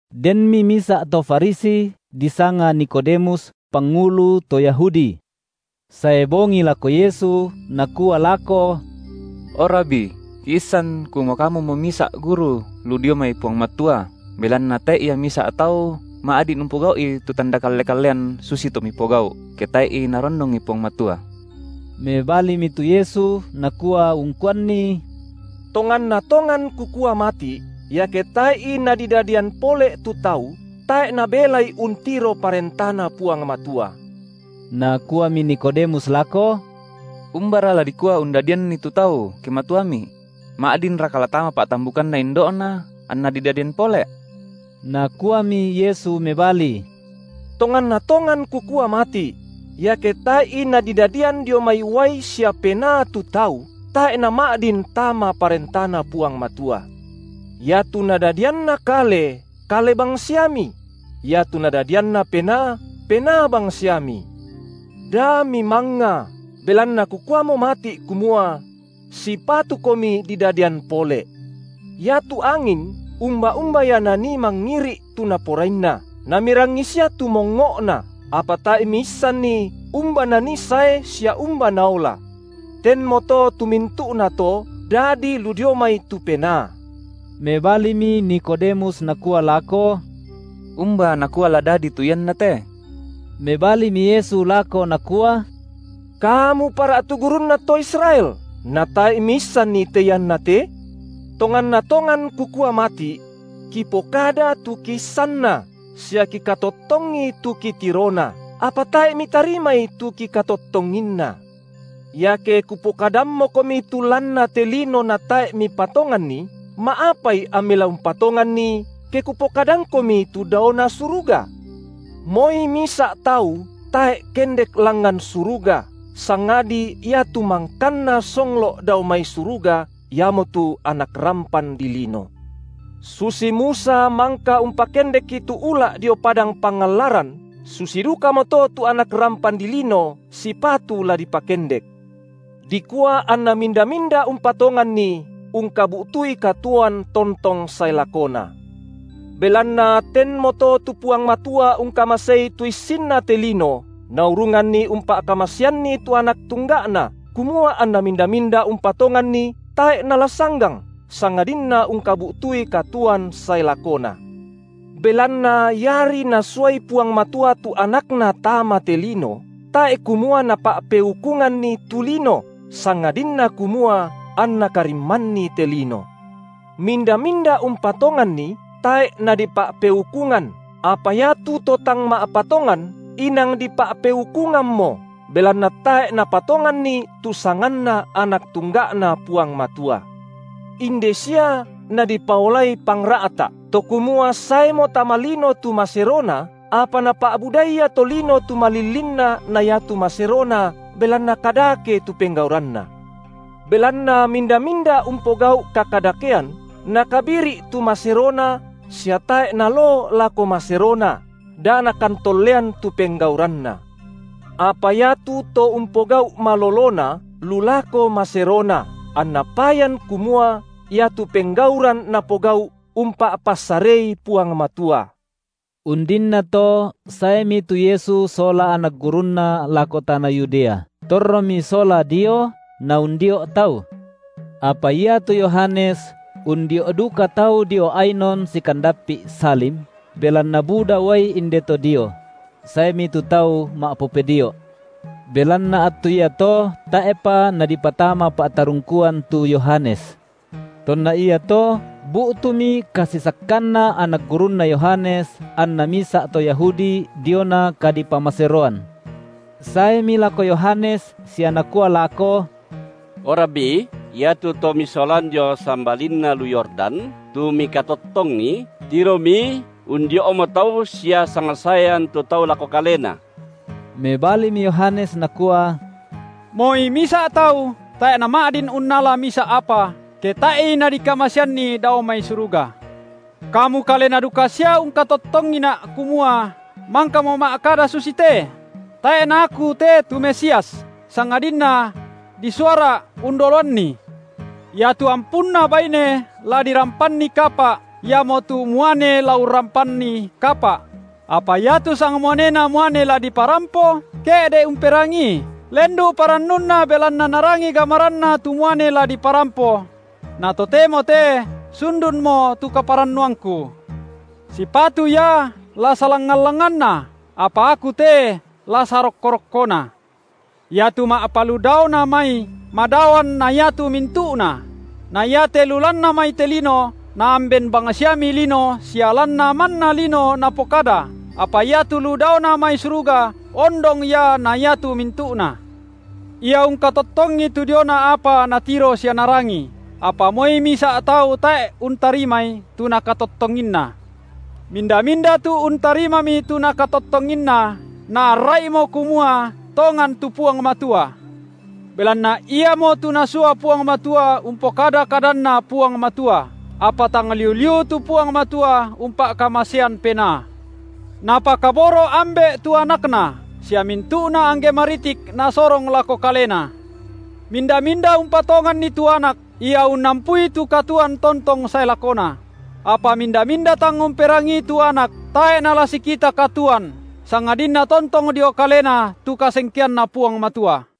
Denmi misa’ to Farisi, disanga Nikodemus, pangulu to Yahudi. Sae bongi lako Yesu, nakua lako: O Rabi, kiissan kumua Kamumo misa’ guru lu dio mai Puang Matua, belanna tae’ ia misa’ tau ma’din umpogau’i tu tanda kalle-kallean susitu Mipogau’, ke tae’i Narondongi Puang Matua. Mebalimi tu Yesu nakua ungkuanni: Tonganna tongan Kukua mati’, iake tae’i nadidadian pole’ tu tau, tae’ nabelai untiro ParentaNa Puang Matua. Nakuami Nikodemus lako: Umbara la dikua undadianni tu tau, ke matuami? Ma’dinraka la tama pa’tambukanna indo’na, anna didadian pole’? Nakuami Yesu mebali: Tonganna tongan Kukua mati’: Iake tae’i nadidadian dio mai uai sia Penaa tu tau, tae’ nama’din tama ParentaNa Puang Matua. Iatu nadadianna kale, kale bangsiami; iatu nadadianNa Penaa, Penaa bangsiami. Da mimangnga, belanna Kukuamo mati’ kumua: Sipatukomi didadian pole’. Iatu angin umba-umba ia nanii mangiri’ tu naporainna, na mirangi sia tu mongngo’na, apa tae’ miissanni umba nanii sae sia umba naola. Tenmoto tu mintu’nato dadi lu dio mai tu Penaa. Mebalimi Nikodemus nakua lako: Umba nakua la dadi tu ianna te? Mebalimi Yesu lako Nakua: Kamu para’ tu gurunna to Israel, natae’ miissanni te iannate? Tonganna tongan Kukua mati’: Kipokada tu kiissanna, sia kikatottongi tu kitirona, apa tae’ mitarimai tu kikatottonginna. Iake Kupokadammokomi tu lanna te lino natae’ mipatonganni, ma’apai ammi la umpatonganni, ke Kupokadangkomi tu daona suruga? Moi misa’ tau tae’ kendek langngan suruga, sangadi Ia tu mangkanna songlo’ dao mai suruga, Iamotu Anak rampan dilino. Susi Musa mangka umpakendekki tu ula’ dio padang pangallaran, susi dukamoto tu Anak rampan dilino sipatu la dipakendek, dikua anna minda-minda umpatonganNi ungkabu’tui katuoan tontong sae lakona. Belanna tenmoto tu Puang Matua ungkamasei tu issinna te lino, naurunganni umpa’kamaseanni tu Anak tungga’Na, kumua anna minda-minda umpatonganNi tae’ nala sanggang, sangadinna ungkabu’tui katuoan sae lakona. Belanna iari Nasuai Puang Matua tu AnakNa tama te lino, tae’ kumua Napa’peukunganni tu lino, sangadinna kumua anNa karimmanni te lino. Minda-minda umpatonganNi, tae’ nadipa’peukungan, apa iatu to tang ma’patongan, inang dipa’peukungammo, belanna tae’ napatonganni tu sanganNa Anak tungga’Na Puang Matua. Inde sia nadipaolai pangra’ta’, to kumua saemo tama lino tu maserona, apa napa’budai ia tolino tu malillinna na iatu maserona belanna kadake tu penggauranna. Belanna minda-minda umpogau’ kakadakean, nakabiri’ tu maserona sia tae’ naloo lako maserona, da nakantollean tu penggauranna. Apa iatu to umpogau’ malolona, lu lako maserona, anna payan kumua iatu penggauran napogau’ umpa’passarei Puang Matua. Undinnato saemi tu Yesu sola anak gurunNa lako tana Yudea; torromi sola dio Naundio’ tau. Apa iatu Yohanes undio’ duka tau dio Ainon sikandappi’ Salim, belanna buda uai inde to dio; saemi tu tau ma’popedio’. Belanna attu iato tae’pa nadipatama pa’tarungkuan tu Yohanes. Tonna iato bu’tumi kasisakkanna anak gurunna Yohanes anna misa’ to Yahudi diona kadipamaseroan. Saemi lako Yohanes sia nakua lako: O Rabi, iatu To misolan dio sambalinna lu Yordan, tu mikatottongi, tiromi undio’mo tau sia sangsaean tu tau lako Kalena. Mebalimi Yohanes nakua: Moi misa’ tau tae’ nama’din unnala misa’ apa, ke tae’i nadikamaseanni dao mai suruga. Kamu kalena duka sia ungkatottongina’, kumua mangkamo’ ma’kada susite: Tae’ na aku te tu Mesias, sangadinna: disuara’ undoloanNi. Iatu ampunna baine la dirampanni kapa’, iamotu muane la urramppanni kapa’; apa iatu sangmuanena muane la diparampo, ke’de’ umperangii, lendu’ parannunna belanna narangi gamaranna tu muane la diparampo; na totemo te sundunmo tu kaparannuangku. Sipatu Ia la salangngan-langnganna, apa aku te la sarokko-rokkona. Iatu ma’paludaona mai, madaoan na iatu mintu’na; na iate lu lanna mai te lino, naamben bangsiami lino sia lanna manna lino napokada, apa iatu lu daona mai suruga, ondong Ia na iatu mintu’na. Ia ungkatottongi tu diona apa Natiro sia Narangi, apa moi misa’ tau tae’ untarimai tu Nakatottonginna. Minda-minda tu untarimami tu Nakatottonginna, naarra’imo kumua tongan tu Puang Matua. Belanna Iamotu Nasua Puang Matua umpokada kadanNa Puang Matua, apa tang liu-liu tu Puang Matua umpa’kamasean Penaa. Napakaboro’ Ambe’ tu AnakNa sia mintu’na angge maritik Nasorong lako Kalena. Minda-minda umpatonganNi tu Anak, ia unnampui tu katuoan tontong sae lakona; apa minda-minda tang umperangii tu Anak, tae’ nala sikita katuoan, sangadinna tontong dio kalena tu kasengkeanNa Puang Matua.